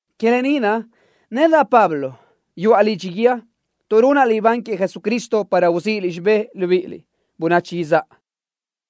Que lë ni naʼ, nedaʼ, Pablo, yuʼa lidxi guíë tuʼ runaʼ libán queëʼ Jesucristo para uzíʼiliʼ xibë́ʼ, libíʼiliʼ, bönachi izáʼa.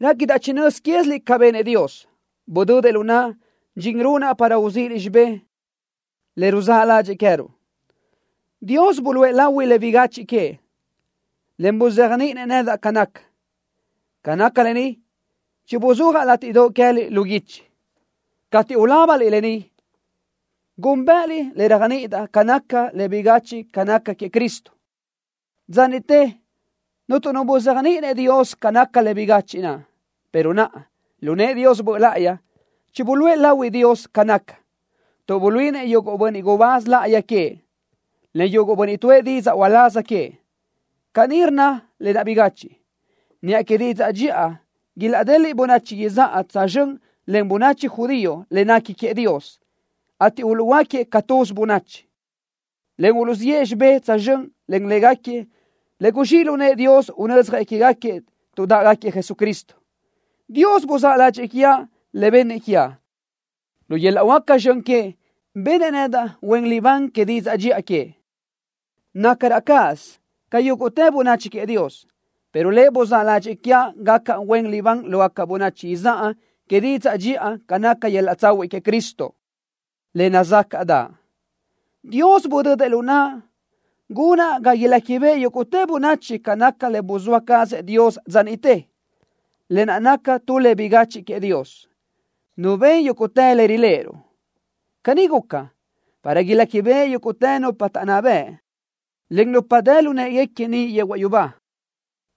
Réquidaʼ chinö́z quéziliʼ ca benëʼ Dios, budödëʼ lu naʼa dxin runaʼ para uzíʼiliʼ xibé le ruzáʼ ládxëʼë queë́ruʼ. Dios buluʼe lahui le bigachiʼ queëʼ, en buzéajniʼinëʼ nedaʼ ca naca. Ca naca lë ni chibuzúajaʼ látiʼdoʼ queë́liʼ lu guichi. Cateʼ ulábaliʼ lë ni, gúnbëʼëliʼ le réajniʼidaʼ ca naca le bigachiʼ ca naca queëʼ Cristo. Dza niʼte cuntu nu buzéajniʼinëʼ Dios ca naca le bigachiʼ naʼ, pero naʼa, lu nëʼë Dios Böʼ Láʼayi, chibuluʼë lahui Dios ca naca, tuʼ buluíʼinëʼ yuguʼ bönniʼ gubáz láʼayi queëʼ, en yuguʼ bönniʼ tuʼë didzaʼ uláz queëʼ. Caní rnna lë naʼ bigachiʼ: “Niʼa que didzaʼ dxiʼa ilaʼdeliʼ bönachi izáʼa tsözxö́n len bönachi judío le nequi queëʼ Dios, ateʼ uluʼhuöáquiëʼ ca tuz bönachi, en uluʼziʼë xibé tsözxö́n len légaquiëʼ le guzxíʼ lu nëʼë Dios unödzjëʼ quégaquiëʼ tuʼ dáʼgaquiëʼ Jesucristo.” Dios buzáʼ ládxëʼë quiaʼ le bennëʼ quiaʼ. Lu yöl-laʼ huáca zxön queëʼ benëʼ nedaʼ huen libán que didzaʼ dxiʼa queëʼ. Nacraʼ cáʼasö ca yúguʼtë bönachi queëʼ Dios, pero Lëʼ buzáʼ ládxëʼë quiaʼ gacaʼ huen libán lógaca bönachi izáʼa que didzaʼ dxiʼa ca naca yöl-laʼ tsahuiʼ queëʼ Cristo, le nazácaʼdaʼ. Dios budödëʼ lu naʼa gunaʼ ga iléquibeʼe yúguʼtë bönachi ca naca le buzóa cazëʼ Dios dza niʼte, lë naʼ naca tu le bigachiʼ queëʼ Dios, Nu ben yúguʼtë le riléʼeruʼ. Caní guca, para iléquibeʼe yúguʼtë nupa taʼnná bëʼ, en nupa dë lu në́ʼeguequi niʼ yehuaʼ yubá,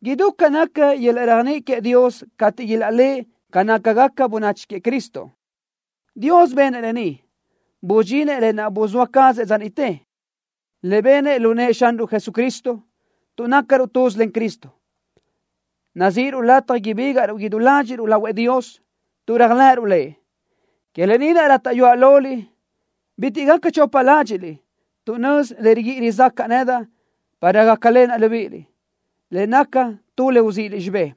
idú ca naca yöl-laʼ réajniʼi queëʼ Dios cateʼ ilaʼléʼe ca nácagaca bönachi queëʼ Cristo. Dios benëʼ lë ni, busudxinëʼ lë naʼ buzóa cazëʼ dza niʼte, le benëʼ lu nëʼë Xanruʼ Jesucristo. Tuʼ nácaruʼ tuz len Cristo, nazíʼiruʼ lataj ibígaʼruʼ idú ladxiʼruʼ lahuëʼ Dios, tuʼ réajlëʼëruʼ Lëʼ. Que lë ni naʼ rátaʼyuaʼ loliʼ bitiʼ gaca chopa ládxiʼliʼ tuʼ nözi le riguíʼi rizácaʼa nedaʼ para gácalenaʼ libíʼiliʼ, le naca tu le uzíʼiliʼ xibé.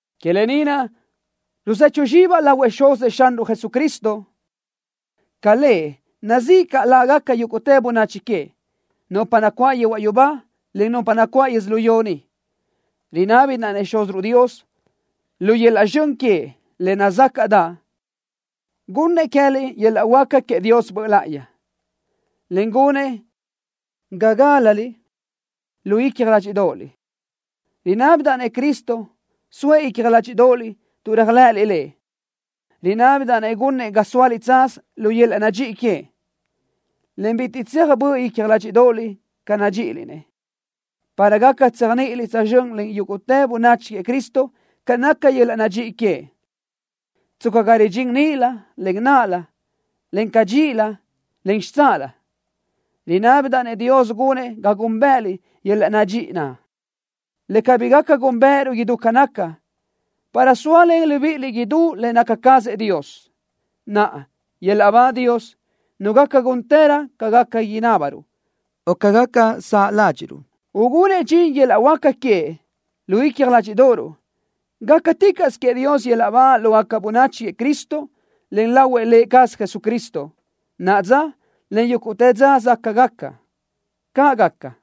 ¡Que lë ni naʼ, ruzechu zxibaʼ lahuëʼ Xuzëʼ Xanruʼ Jesucristo! Ca lëʼ, nazíʼi caʼ lágaca yúguʼtë bönachi queëʼ, nupa nacuáʼ yehuaʼ yubá, en nupa nacuáʼ yödzölió ni. Rinábidaʼ-nëʼ Xúziruʼ Dios, lu yöl-laʼ zxön queëʼ, le nazácaʼdaʼ, gunnëʼ queë́liʼ yöl-laʼ huáca queëʼ Dios Böʼ Láʼayi, en gunëʼ ga gálaliʼ lu icja ládxiʼdoʼoliʼ. Rinábidaʼ-nëʼ Cristo soëʼ icja ládxiʼdoʼoliʼ tuʼ réajlëʼëliʼ Lëʼ. Rinábidaʼ-nëʼ gunëʼ ga sóaliʼ tsaz lu yöl-laʼ nadxíʼi queëʼ, en bitiʼ tséaj böʼ icja ládxiʼdoʼoliʼ ca nadxíʼiliʼ-nëʼ, para gaca tséajniʼiliʼ tsözxö́n len yúguʼtë bönachi queëʼ Cristo ca naca yöl-laʼ nadxíʼi queëʼ, tsca ga ridxín níʼilö, en náʼalö, en cadxíʼilö, en xitsáʼalö. Rinábidaʼ-nëʼ Dios gunëʼ ga gúnbëʼëliʼ yöl-laʼ nadxíʼi naʼ, le cabí gaca gúnbëʼëruʼ idú ca naca, para sóalen libíʼiliʼ idú le naca cazëʼ Dios. ¡Naʼa, yöl-laʼ ba Dios, Nu gaca gúntërö ca gaca inábaruʼ o ca gaca saʼ ládxiʼruʼ, ugunëʼ dxin yöl-laʼ huáca queëʼ lu icja ládxiʼdoʼoruʼ! ¡Gácaticaʼsö queëʼ Dios yöl-laʼ ba lógaca bönachi queëʼ Cristo, en lahuëʼ Lë cazëʼ Jesucristo, naʼa dza, en yúguʼtë dza záʼgaca! ¡Caʼ gaca!